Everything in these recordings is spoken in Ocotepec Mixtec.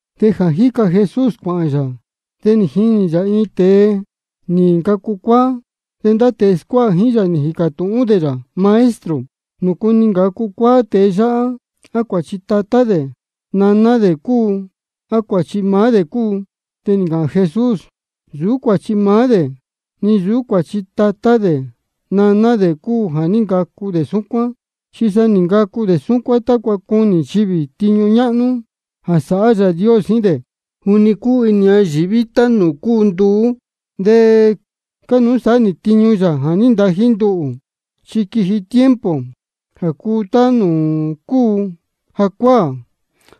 De jā jíca Jesús cuāhān yā, de nī jinī yā nūū iin tēe nī ncacu cuáá. De ndá tēe scuáha jíín yā nī jīcā tūhún dē yā: Maestro, ¿nūcu nī ncacu cuáá tēe yáhá? ¿A cuāchi tatá dē naná dē cúu, á cuāchi maá dē cúu? De nī ncāhān Jesús: Nsūú cuāchi maá dē, ni nsūú cuāchi tatá dē naná dē cúu jā ní ncacu dē súcuán, chi sa nī ncacu dē súcuán tácua cunī nchivī tiñu ñáhnú jā sāhá Yāā Dios jíín dē. Juni cúu inī ñayīví tá nūū cúu nduú, de cánuú sāhá nī tiñu Yāā jā ní ntají nduhū. Chi quiji tiempo jā cuu tá nūū cúu jacuáā,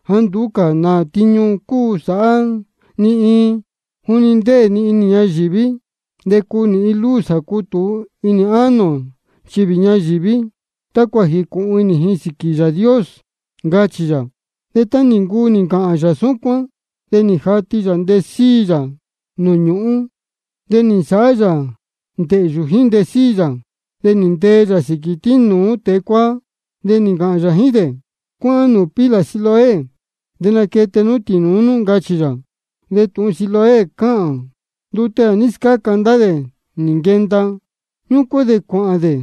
jāá nduú cā nā tiñu cuu sāhá ni iin. Juni ndéē ni inī ñayīví, de cúu nī luz jā cútūu inī ánō nchivī ñayīví, tácua jīcūhun inī ji sīquī Yāā Dios, ncachī yā. De tá nī ncuu nī ncāhān yā súcuán, de nī jati yā ntesíi yā nūū ñūhún, de nī nsāhá yā ndēhyū jíín ntesíi yā, de nī ntee yā sīquī tínūú tēe cuáá. De nī ncāhān yā jíín dē: Cuáhán nūū pila Siloé de naquete nú tīnūú nú, ncachī yā. De tūhun Siloé cáhān: Ndute jā ní scáca ndá dē nī nquenda. Ñúcuán de cuāhān dē,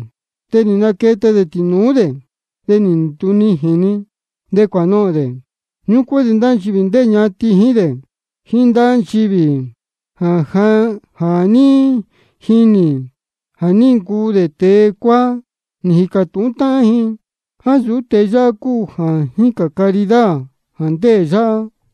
de nī naquete dē tīnūú dē, de nī ndunijīn-ni, de cuānohōn dē. Ñúcuán de ndá nchivī ndéē ñatin jíín dē, jíín ndá nchivī jā ní jinī jā ní ncuu dē tēe cuáá, nī jīcā tūhún táhán ji: ¿A nsūú tēe yáhá cúu jā jícān caridad jā ndéē yáhá?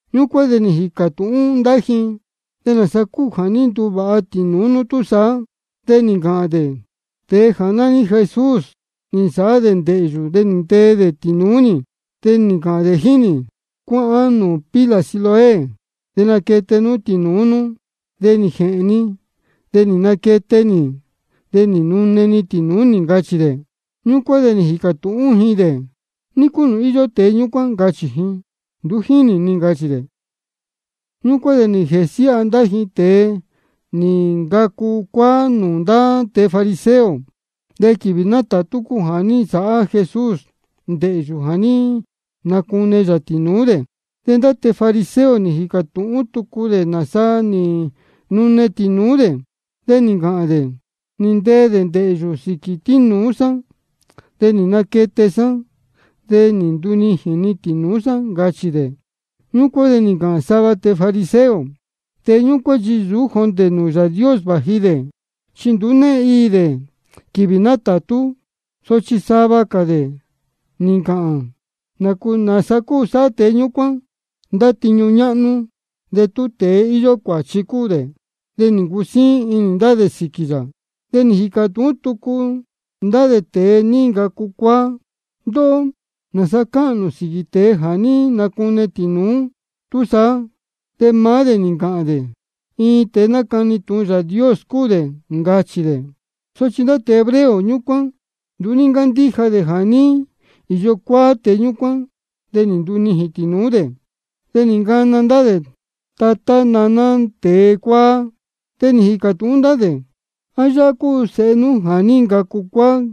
Ñúcuán de nī jīcā tūhún ndá ji: ¿De nāsa cúu jā ní nune tīnūú nú túsaá? De nī ncāhān dē: Tēe nání Jesús nī nsāhá dē ndēhyū, de nī ntee dē tīnūú nī, de nī ncāhān dē jíín nī: Cuáhán nūū pila Siloé de naquete nú tīnūú nú. De nī jēhēn ni, de nī naquete nī, de nī nune-ni tīnūú nī, ncachī dē. Ñúcuán de nī jīcā tūhún ji dē: ¿Ní cúu nūū íyó tēe ñúcuán? ncachī ji. Nduú jínī ni, ncachī dē. Ñúcuán de nī jēsiáha ndá ji tēe nī ncacu cuáá nūū ndá tēe fariseo. De quīvī nátātú cúu jā ní nsāhá Jesús ndēhyū jā ní nacune yā tīnūú dē. De ndá tēe fariseo nī jīcā tūhún tucu dē nāsa nī nune tīnūú dē. De nī ncāhān dē: Nī ntee dē ndēhyū sīquī tínūú sá, de nī naquete sá, de nī ndunijīn-ni tīnūú sá, ncachī dē. Ñúcuán de nī ncāhān sava tēe fariseo: Tēe ñúcuán chi nsūú jondē nūū Yāā Dios vāji dē, chi nduú née iī dē quīvī nátātú. Sochi sava cā dē nī ncāhān: ¿Nāsa cuu sāhá tēe ñúcuán ndá tiñu ñáhnú de tú tēe íyó cuāchi cúu dē? De nī ncusíín inī ndá dē sīquī yā. De nī jīcā tūhún tucu ndá dē tēe nī ncacu cuáá: Ndóhó, ¿nāsa cáhān nū sīquī tēe jā ní nacune tīnūú nú túsaá? De maá dē nī ncāhān dē: Iin tēe nácani tūhun Yāā Dios cúu dē, ncachī dē. Sochi ndá tēe hebreo ñúcuán nduú ní ncándíja dē jā ní īyo cuáá tēe ñúcuán de nī ndunijīn tīnūú dē. De nī ncana ndá dē tatá naná tēe cuáá. De nī jīcā tūhún ndá dē: ¿A yáhá cúu sēhe nú jā ní ncacu cuáá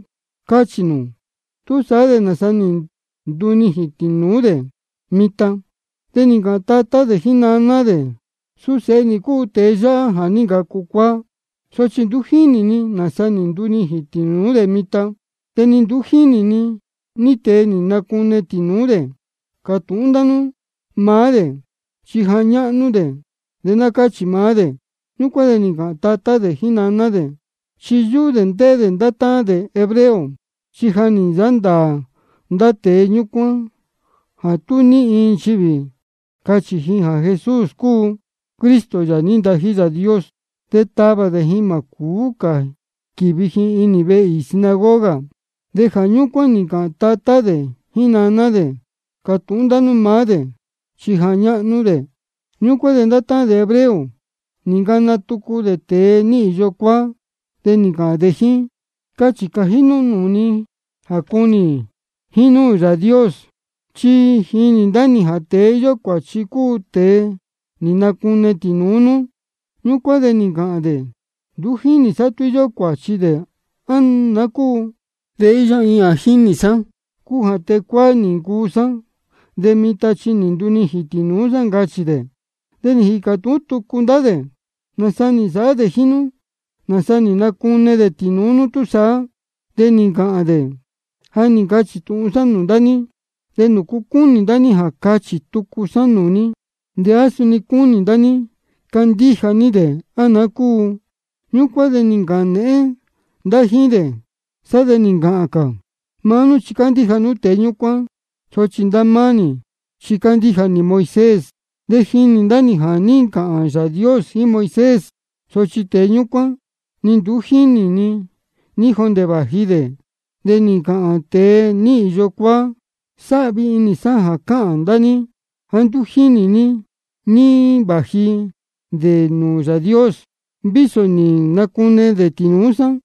cáchī nū? ¿Túsaá de nāsa nī ndunijīn tīnūú dē mitan? De nī ncāhān tatá dē jíín naná dē: Suu sēhe nī cúu tēe yáhá jā ní ncacu cuáá. Sochi nduú jínī ni nāsa nī ndunijīn tīnūú dē mitan, de ni nduú jínī ni ní tēe nī nacune tīnūú dē. Cātūhún ndá nú maá dē, chi ja ñáhnú dē, de ná cáchī maá dē. Súcuán nī ncāhān tatá dē jíín naná dē, chi yúhú dē ndéhé dē ndá táhán dē tēe hebreo. Chi ja nī nsāhá ndāā ndá tēe ñúcuán jā tú ní iin nchivī cachī ji jā Jesús cúu Cristo, Yāā nī ntají Yāā Dios, de tavā dē ji jā má cūú cā quīvi ji inī vehe īī sinagoga. Jā ñúcuán nī ncāhān tatá dē jíín naná dē: Cātūhún ndá nú maá dē, chi ja ñáhnú dē. Ñúcuán de ndá tēe hebreo nī ncana tucu dē tēe nī īyo cuáá. De nī ncāhān dē jíín: Cachī cājí nú nūū ni jā cunī jínúū Yāā Dios. Chi jínī ndá nī jā tēe íyó cuāchi cúu tēe nī nacune tīnūú nú. Ñúcuán de nī ncāhān dē: Nduú jínī sá tú íyó cuāchi dē, á naá cúu. De íyó iin jā jínī sá, cúu jā tēe cuáá nī ncuu sá, de mitan chi nī ndunijīn tīnūú sá, ncachī dē. De nī jīcā tūhún tucu ndá dē: ¿Nāsa nī nsāhá dē jíín nú? ¿Nāsa nī nacune dē tīnūú nú túsaá? De nī ncāhān dē: Ja nī ncachī tūhun sá nūū ndá ní, de nduú cúnī ní cuetáhví ní. ¿De nūcu cúnī ndá ní jā cachī tucu sá nūū ní? ¿De á suni cúnī ndá ní candíja ní dē, á naá cúu? Ñúcuán de nī ncāhān nēhén ndá jíín dē, sá de nī ncāhān cā: Maá nú chi cándíja nú tēe ñúcuán, sochi ndá máá nī chi cándíja nī Moisés. De jínī ndá nī jā ní ncāhān Yāā Dios jíín Moisés. Sochi tēe ñúcuán, ni nduú jínī ni ní jondē vāji dē. De nī ncāhān tēe nī īyo cuáá: Sáhvi inī sá jā cáhān ndá ní jāá nduú jínī ní jā váji dē nūū Yāā Dios, vísō nī nacune dē tīnūú sá.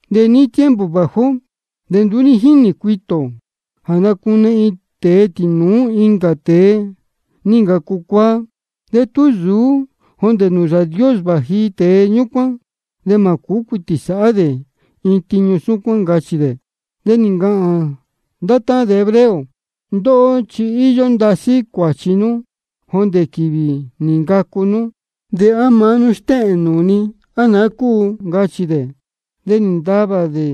De níí tiempo vāji ó, de nduú ní jínī cuitī ō jā nácune iin tēe tīnūú incā tēe nī ncacu cuáá. De tú nsūú jondē nūū Yāā Dios vāji tēe ñúcuán, de mā cūú cuitī sāhá dē iin tiñu súcuán, ncachī dē. De nī ncāhān ndá tēe hebreo: Ndóhó chi íyó ndasí cuāchi nú jondē quīvī nī ncacu nú, ¿de á maá nú stéhēn nūū ni, á naá cúu? ncachī dē. De nī ntavā ndá dē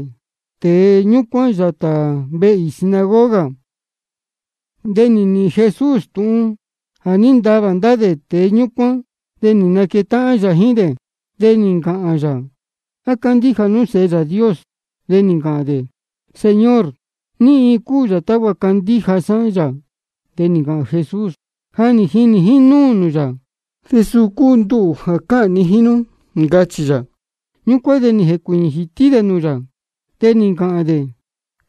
tēe ñúcuán yātā vehe īī sinagoga. De nī nīhīn Jesús tūhun jā ní ntavā ndá dē tēe ñúcuán. De nī naquetáhán yā jíín dē, de nī ncāhān yā: ¿A cándíja nú Sēhe Yāā Dios? De nī ncāhān dē: Señor, ¿ní iin cúu yā tácua candíja sá yā? De nī ncāhān Jesús: Ja nī jinī nū nūū yā, de suu cúu nduhū jā cáhān ni jíín nú, ncachī yā. Ñúcuán de nī jēcuīñī jītí dē nūū yā, de nī ncāhān dē: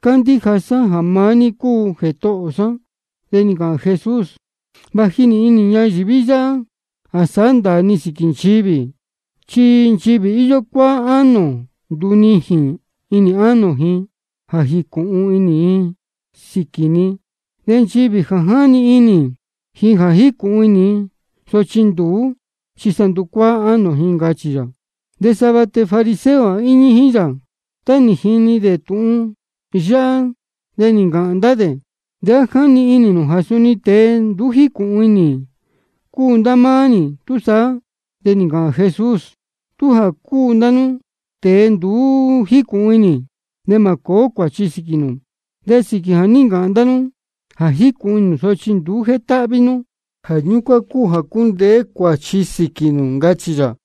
Cándíja sá jā maá ní cúu Jētohō sá. De nī ncāhān Jesús: Vāji nī inī ñayīví yáhá jā sāhá ndāā ni sīquī nchivī. Chi nchivī íyó cuáá ánō, ndunijīn inī ánō ji jā jīcūhun inī ji sīquī ni. De nchivī jā jáni inī ji jā jícūhun inī ji, sochi nduú, chi sa nducuáá ánō ji, ncachī yā. De sava tēe fariseo jā íñí jíín yā, tá nī jini dē tūhun yáhá, de nī ncāhān ndá dē: ¿De á jáni inī nū jā suni tēe nduú jícūhun inī cúu ndá máá nī túsaá? De nī ncāhān Jesús: Tú jā cúu ndá nú tēe nduú jícūhun inī, de mā cōó cuāchi nú. De sīquī jā ní ncāhān ndá nú jā jícūhun inī nū, sochi nduú jétáhví nú, jā ñúcuán cúu jā cundeē cuāchi nú sīquī nū, ncachī yā.